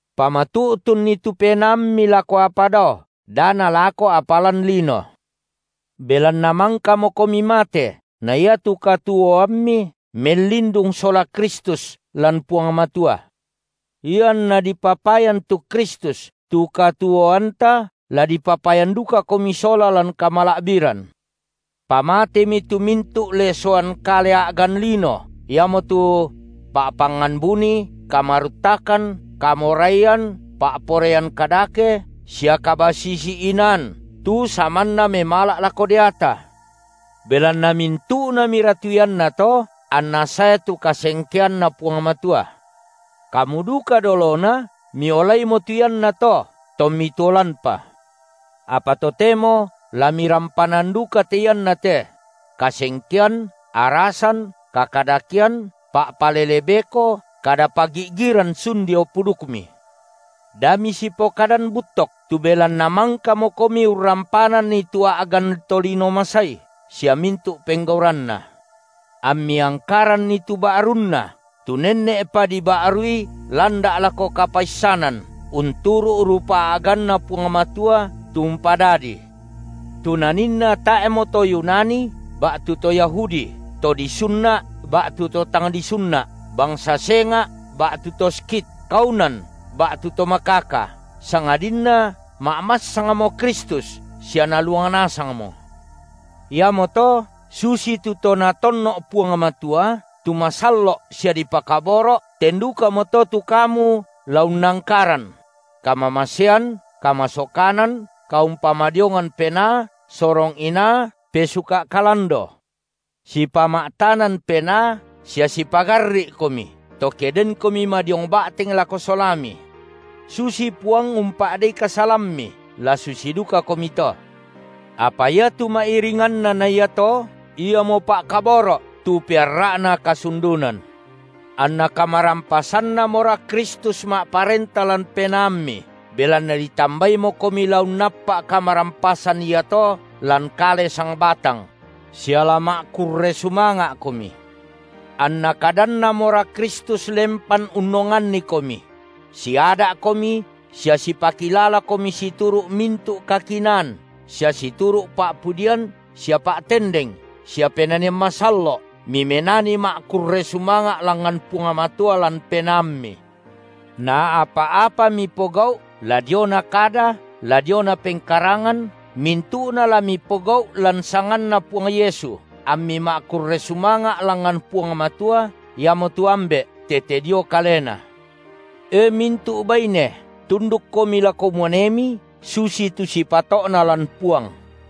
Pamatu’tunni tu penaammi lako apa dao, da nalako apa lan lino. Belanna mangkamokomi mate, na iatu katuoammi mellindung sola Kristus lan Puang Matua. Ianna dipapayan tu Kristus, tu katuoanta, la dipapayan dukakomi sola lan kamala’biran. Pamatemi tu mintu’ lesoan kale a’gan lino, iamotu: pa’pangngan buni, kamaruttakan, kamoraian, pa’poraian kadake, sia kabasisi-inaan, tu samanna memala’ lako deata; belanna mintu’namira tu iannato anna sae tu kasengkeanNa Puang Matua; kamu duka dolona miolaimo tu iannato, tommi tuo lanpa. Apa totemo la mirampanan duka te iannate: kasengkean, arasan, kakadakean, pa’palele beko, kada pagi’giran sun dio pudukmi. Da misipokadan buttok, tu belanna mangkamokomi urrampananni tu a’gan tolino masai sia mintu’ penggauranna, ammi angkaranni tu ba’runna, tu nenne’pa diba’rui landa’ lako kapaissanan unturu’ rupa a’ganNa Puang Matua tu umpadadii. Tu naninna tae’mo to Yunani ba’tu to Yahudi, to disunna’ ba’tu to tang disunna’, bangsa senga’ ba’tu to Skit, kaunan ba’tu to makaka, sangadinna ma’massangmo Kristus sia Naluang nasangmo. Iamoto, susitu to Natonno’ Puang Matua, tu masallo’ sia dipakaboro’, ten dukamoto tu kamu la unnangkaran: kamamasean, kamasokanan, kaumpamadiongan penaa, sorong inaa, pesuka’ kalando, sipama’tanan penaa sia sipagarri’komi, to ke denkomi madiong ba’teng lako solami. Susi Puang umpa’dei kasalammi, la susi dukakomi to. Apa iatu ma’iringanna na iato, iamo pa’kaboro’, tu pearra’na kasundunan. Anna kamarampasanNamora Kristus ma’parenta lan penaammi, belanna ditambaimokomi la unnappa’ kamarampasan iato lan kale sangbatang; sia la ma’kurre sumanga’komi. Anna kadanNamora Kristus lempan unnongannikomi; siada’komi sia sipakilalakomi situru’ mintu’ kakinaan, sia situru’ pa’pudian sia pa’tendeng sia penanian masallo’ mimenani ma’kurre sumanga’ langngan Puang Matua lan penaammi. Na apa-apa mipogau’, la diona kada la diona pengkarangan, mintu’na la mipogau’ lan sanganNa Puang Yesu, ammi ma’kurre sumanga’ langngan Puang Matua, iamotu Ambe’, tete dio Kalena. E mintu’ baine, tundukkomi lako muanemi, susitu sipato’na lan Puang.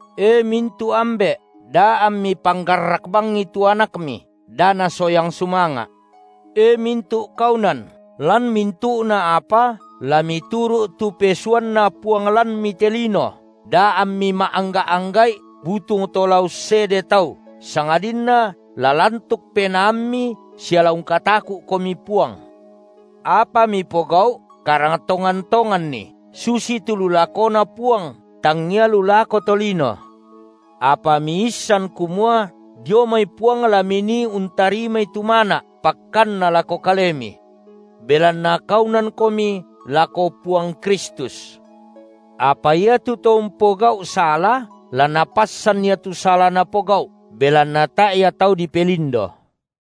E mintu’ ambe’, da ammi panggarrak bangi tu anakmi, da nasoyang sumanga’. E mintu’ kaunan, lan mintu’na apa la mituru’ tu pesuanna puang lanmi te lino, da ammi ma’angga’-angga’i butung to la ussede tau, sangadinna la lantuk penaammi sia la ungkataku’komi Puang. Apa mipogau’, karang tongan-tonganni, susitu lu lakoNa Puang, tangia lu lako tolino, apa miissan kumua dio mai Puang la minii untarimai tu mana’, pakkanna lako kalemi. Belanna kaunankomi lako Puang Kristus. Apa iatu to umpogau’ sala, la napassan ia tu sala napogau’, belanna tae’ ia tau dipelindo.